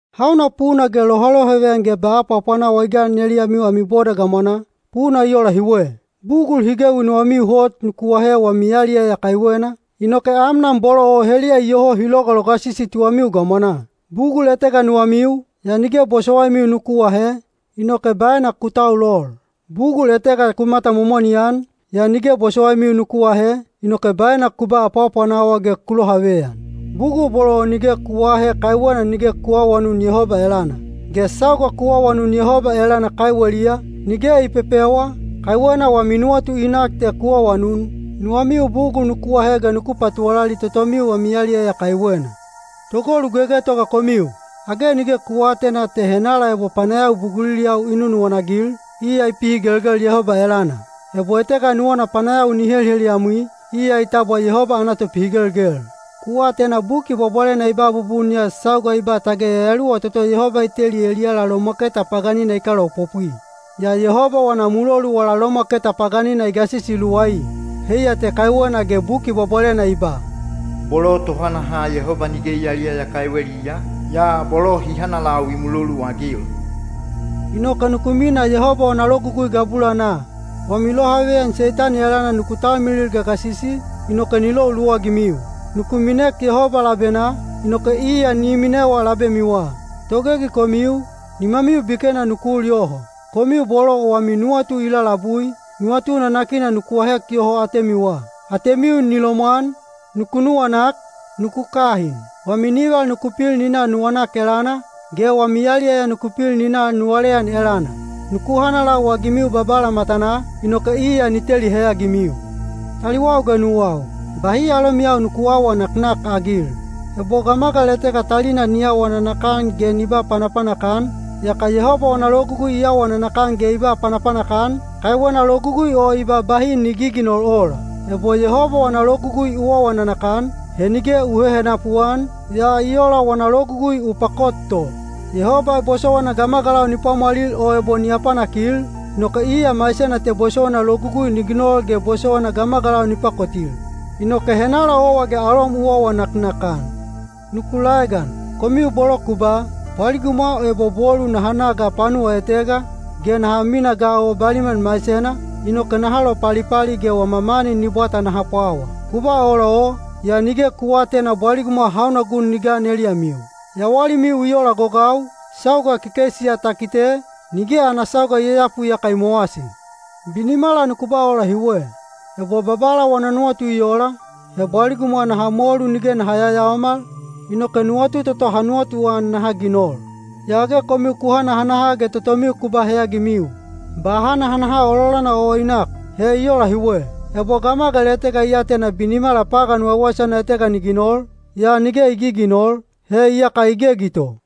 Hauna puna ge lohalohaveyan ge ba apwaapwanawa i gan eliyamiu ami boda gamwanaa? Puna i ola hiwe: bugul hi gewi nuwamiu hot nuku ahe wami yaliyaya kaiwena, inoke amnan bolo o heliya iyoho hi logalogasisi tuwamiu gamwanaa. Bugul etega nuwamiu, yaa nige bosowaimiu nuku ahe, inoke baena ku taulol. Bugul etega ku matamomoni-an, yaa nige bosowaimiu nuku ahe, inoke baena ku ba apwaapwanawa ge ku lohaveyan. Bugul bolo o nige ku aahe kaiwena nige ku aawanun Yehoba elana. Ge sauga ku awanun Yehoba elana kaiweliya, nige i pepewa, kaiwena wami nuwatu i nak te ku awanun, nuwamiu bugul nuku ahe ge nuku patuwalali totomiu wami yaliyaya kaiwena. Togolu gegetoga komiu! Age nige ku aatena te henala ebo panayawi buguliliyau i nunuwana-agil, iya i pihigelgel Yehoba elana? Ebo etega nuwana panayawi ni heliheliyamwi, iya i tabwa Yehoba ana topihigelgel. Ku atena Buki Bwabwalena i ba bubun ya sauga i ba tage yayaluwa toto Yehoba i teli eliyala lomwaketa paganina i kalaopopwi. Yaa Yehoba wana mulolu wala lomwaketa paganina i gasisi luwai. Heiya te kaiwena ge Buki Bwabwalena i ba: Bolo tohanaha Yehoba nige i yaliyaya kaiweliya, yaa bolo hi hanalau i muloluagil. Inoke nuku minaa Yehoba wana logugui gabulanaa. Wami lohaveyan Seitani elana nuku talmilil gagasisi, inoke ni lou luwagimiu. Nuku minek Yehoba labenaa, inoke iya ni minewa labemiwa. Togegi komiu, nimamiu bikena nuku ul yoho. Komiu bolo wami nuwatu i lalabui, nuwatu nanakina nuku ahek yoho atemiwa. Atemiu ni lomwan, nuku nuwanak, nuku kahin. Wami nival nuku pil ni na nuwanak elana, ge wami yaliyaya nuku pil ni na nuwaleyan elana. Nuku hanalau-agimiu Babala matanaa, inoke iya ni teli heyagimiu. Taliwau ge nuwau, bahi alomiyau nuku aawa naknakagil. Ebo gamagal etega talina ni awa nanakan ge ni ba panapanak-an, yaka Yehoba wana logugui i awa nanakan ge i ba panapanak-an, kaiwena logugui o i ba bahi ni giginol ola. Ebo Yehoba wana logugui u awa nanakan, he nige u hehenapu-an, yaa i ola wana logugui u pakot to. Yehoba bosowaina gamagalau ni pwamwalil o ebo ni apanakil, inoke iya maisena te bosowaina logugui ni ginol ge bosowaina gamagalau ni pakotil. Inoke henala owa ge alom u awa naknakan? Nuku laegan, komiu bolo ku ba, “Bwaligumwa o ebo bolu naha na ga panuwa etega, ge naha minaa ga o baliman maisena, inoke naha lopalipali ge wama mani ni bwata naha pwawa.” Ku ba ola o, yaa nige ku aatena bwaligumwa hauna gun ni gan eliyamiu. Yawalimiu i ola gogau, sauga kekeisi ya ta kite, nige ana sauga i yayapu yaka i mowasi. Binimala nuku ba ola hiwe, “Ebo Babala wana nuwatu i ola, he bwaligumwa naha molu nige naha yayaomal, inoke nuwatu toto ha nuwatuan naha ginol.” Yaa age komiu ku hanahanaha ge totomiu ku ba heyagimiu. Ba hanahanaha ololana o i nak. He i ola hiwe. Ebo gamagal etega i atena binimala pagan waiwaisana etega ni ginol, yaa nige i giginol, he iyaka i gegi to.